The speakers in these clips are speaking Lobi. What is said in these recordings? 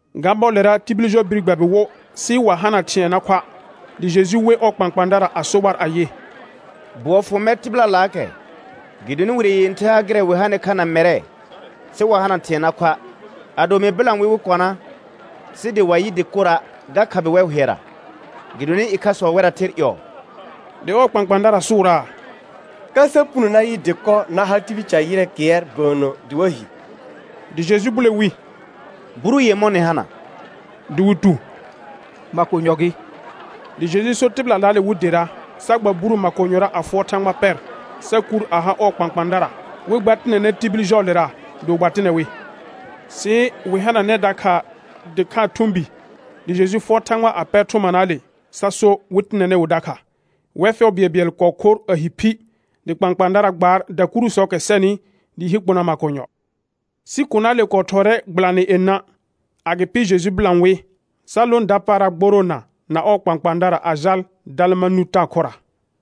Ga bɔɔlera tibil jɔ bir gbɛbɩ wo, sɩ wa hana thɩ̃ɛ na khoa'; dɩ Jeju we ɔɔ kpãkpãadara a so war ayɩ: Bʋɔ fʋ mɛr tɩbɩlalaakɛ, gɩdonɩ wire yẽther ha gɩrɛ wɩ hanɩ kha na mɛrɛ, sɩ wa hana thɩ̃ɛ na khoa'. Ado mɩ bɩlã wɩ wɩ kɔna sɩ dɩ wa yɩ dɩkora', ga khabɩ wɛr hʋɛra, gɩdonɩ ɩkhasɔ wɛrra ther ƴɔɔ. Dɩ ɔɔ kpãkpãadara sʋʋraa: Ka sa puno na yɩ dɩkɔ na ha tibil ca ƴɩrɛ kɩɛr bəənnə dɩ wa hi. Dɩ Jeju bule wi: Buru yemɔ̃ nɩ hana? Dɩ wɩ tu: Makonyɔ gɩ. Dɩ Jeju so tɩbɩlalaale wɩ dera, sa gba buru makonyɔra a fʋɔr Thãgba pɛr, sa kuur a ha ɔɔ kpãkpãadara, wɩ gba tɩnɛnɛ tibil jɔɔlera; dɩ wɩ gba tɩnɛ wɩ. Sɩ wɩ hananɛ dakha dɩkhaa thʋ̃ bi, dɩ Jeju fʋɔr Thãgba a pɛr thʋmanaale, sa so wɩ tɩnɛnɛ wɩ dakha. Wɛr fɛʋ bɩɛlbɩɛl kɔɔ khor a hi phi; dɩ kpãkpãadara gbaar dakurusɔɔkɛ sɛnɩ dɩɩ hi kpona makonyɔ. Sɩ konaale kɔɔ thɔɔrɛ gbɩlanɩ yenã. Agɩpɩ Jeju bɩlã wɩ, sa lõ dapaara gboroona na ɔɔ kpãkpãadara a jal Dalmanuta khʋra.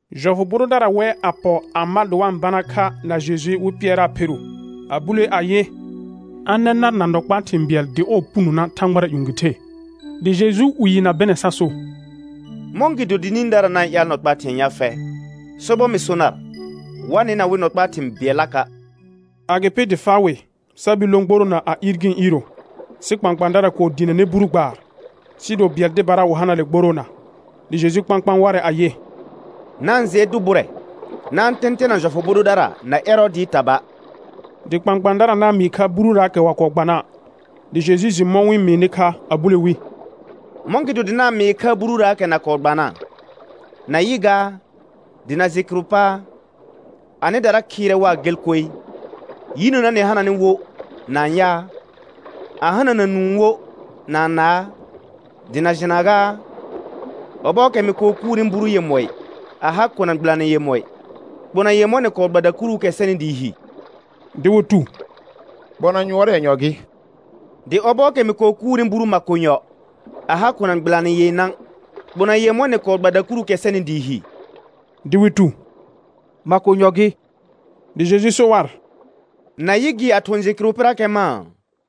Jɔfʋ bʋ dʋdara wɛ, a pɔ a ma dɩ wa-n bana kha na Jeju wɩ pɩɛraa pheru, a bulee ayɩ, a nɛ nar na nɔ kpaa thɩ̃ bɩɛl dɩ ɔɔ punona thãgbara ƴũ gɩ the. Dɩ Jeju 'wɩɩ na bɩnɛ sa so: Mɔ̃gɩdo dɩ nĩdara na-n ƴaal nɔ kpaa thɩ̃ɛ ya fɛ? Sobɔr mɩ so nar, wa nɩna wɩ nɔ kpaa thɩ̃ bɩɛllaka'. Agɩpɩ dɩ faa wɩ, sa bir lõ gboroona a iir gɩ̃ iiro. Sɩ kpãkpãadara kɔɔ diinəne buru gbaar, sɩɩ do bɩɛl dɩbara wɩ hana le gboroona. Dɩ Jeju kpãkpãa warɛ ayɩ: Na-n jɩɛ dʋ bʋrɛ, na-n tɛ̃tɛna jɔfʋ bʋ dʋdara na Ɛrɔɔdɩɩ taba'. Dɩ kpãkpãadara na-n mɩɩ kha bururaakɛ wa kɔɔ gbana'. Dɩ Jeju jɩ mɔ̃ wɩ-n mɩɩnɩ kha a bule wi: Mɔ̃gɩdo dɩ na-n mɩɩ kha bururaakɛ na kɔɔ gbana? Na yɩ gaa, dɩ na jɩ kɩrʋ paa? Anɩdara khɩɩrɛ waa gel koe. Yinəna nɩ hananɩ wo na-n yaa? A hanana nũu wo na-n naa? Dɩ na jɩna gaa? Ɔbɔɔkɛ mɩ kɔɔ kuurni buru yemɔɩ a ha kona gbɩlanɩ yemɔɩ, kpona yemɔ̃ nɩ kɔɔ gba dakuruukɛ sɛnɩ dɩɩ hi? Dɩ wɩ tu: Kpona yʋɔr yenyɔ gɩ. Dɩ ɔbɔɔkɛ mɩ kɔɔ kuurni buru makonyɔ a ha kona gbɩlanɩ yenã, kpona yemɔ̃ nɩ kɔɔ gba dakuruukɛ sɛnɩ dɩɩ hi? Dɩ wɩ tu: Makonyɔ gɩ. Dɩ Jeju so war: Na yɩ gɩ a thʋ̃ jɩ kɩrʋ pɩrakɛ mãa?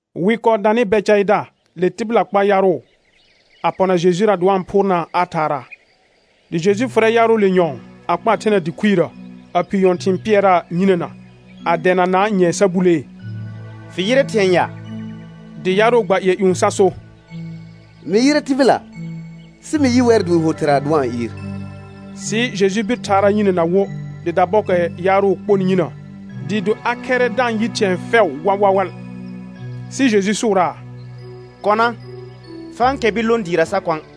Wɩ kɔɔ danɩ Bɛcaɩda le tɩbɩla kpa yaarʋ, a pɔna Jejura dɩ wa-n phʋʋrnaa a thaaraa. Dɩ Jeju fʋrɛ yaarʋʋle nyɔ̃ɔ, a kpaa thena dɩ khuirə, a phii nyɔ̃thɩ̃ɩ pɩɛraa yinəna, a dɛɛnanaa nyɛ̃ɛ sa bulee: Fɩ yɩrɛ thɩ̃ɛ ya? Dɩ yaarʋ gba ƴɩɛ ƴũ sa so: Mɩ yɩrɛ tɩbɩla, sɩ mɩ yɩ wɛr dɩ wɩ ho thɩra dɩ wa-n ɩɩr. Sɩ Jeju bir thaaraa yinəna wo, dɩ dabɔɔkɛ yaarʋ kponɩ yinə, dɩɩ do a khɛrrɛ da-n yɩ thɩ̃ɛ fɛʋ wawawal. Sɩ Jeju sʋʋraa: Kɔna, fa-n kɛr bir lõ dɩɩra sa kɔ̃a'.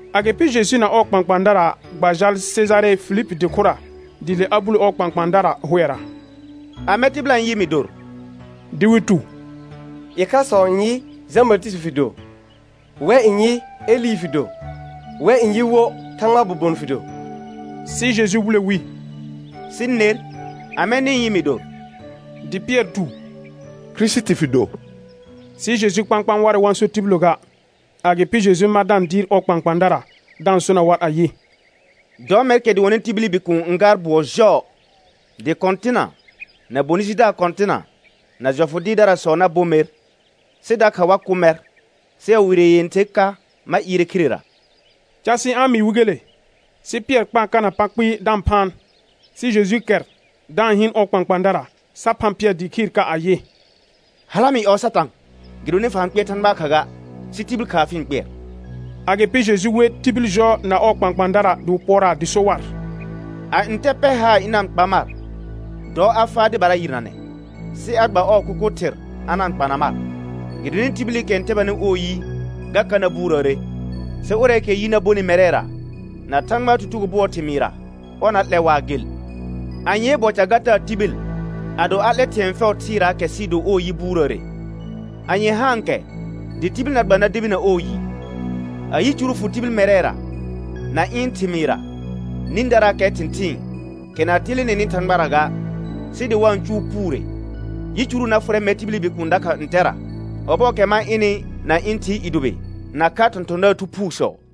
Agɩpɩ Jeju na ɔɔ kpãkpãadara gba jal Sejare Filipi dɩ khʋra; dɩ le a bule ɔɔ kpãkpãadara hʋɛra: Amɛ tɩbɩla n yɩ mɩ dor? Dɩ wɩ tu: Ɩkhasɔ n yɩ, Jã Batɩsɩtɩ fɩ do; wɛ n yɩ, Elɩ fɩ do; wɛ n yɩ wo, Thãgbaa bobon fɩ do. Sɩ Jeju bule wi: Sɩ ner, amɛ nɩ-n yɩ mɩ dor? Dɩ Pɩɛr tu: Kirisiti fɩ do. Sɩ Jeju kpãkpãa warɛ, wa-n so tibillə ga. Agɩpɩ Jeju ma da-n dɩɩr ɔɔ kpãkpãadara, da-n sona war ayɩ: Dɔ mɛrkɛ dʋɔnnɩ tibili Bikuun n gaar bʋɔ jɔɔ; dɩ kɔ̃tɩna, na bonɩ jidaar kɔ̃tɩna, na jɔfʋ dɩɩrdarasɔ na bo mer, sɩ dakha wa kʋ mɛr, sɩ a wire yẽther ka ma ɩɩrɛ khirera. Casɩ a-n mɩɩ wɩ gele. Sɩ Pɩɛr kpaa kana pa kpɩɩ da-n phaan. Sɩ Jeju kɛr, da-n hɩɩn ɔɔ kpãkpãadara, sa phã Pɩɛr dɩɩ khɩɩr ka ayɩ: Hala mɩ ƴɔɔ Satã, gɩdonɩ fa-n kpɩɛr Thãgbaa kha ga, sɩ tibil khaa fɩ-n kpɩɛr. Agɩpɩ Jeju we tibil jɔ na ɔɔ kpãkpãadara dɩ wɩ pʋɔraa dɩ so war: A ntɛ pɛr haar ɩna-n kpa mar, dɔ a faa dɩbara yɩrnanɛ, sɩ a gba ɔɔ kʋkʋ thɩr a na-n kpana mar. Gɩdonɩ tibilikɛ n tɛbanɩ ɔɔ yi, ga ka na buurəəre; sɩ ʋrɛɛkɛ yi na bonɩ mɛrɛra, na Thãgbaa tutugo bʋɔɔ thɩmɩɩra, ɔr na lɛ waa gel. Anyee bɔ ga taa tibil, ado a 'lɛ thɩ̃ɛ fɛʋ thɩɩraakɛ sɩɩ do ɔɔ yi buurəəre. Anye haankɛ dɩ tibil na gba na debina ɔɔ yi? A yicuru fʋ tibil mɛrɛra na ɩ̃ thɩmɩɩra nĩdaraakɛ thɩ̃thɩɩn, kɛ na telenenɩ Thãgbara ga, sɩ dɩ wa-n cʋʋ puure, yicuru na fʋrɛ mɛr tibili Bikuun dakha ntɛra, ɔbɔɔkɛ ma ɩnɩ na ɩ̃ Thɩɩ i dʋbɩ nakha thɔ̃thɔ̃daar thu phuusɔ.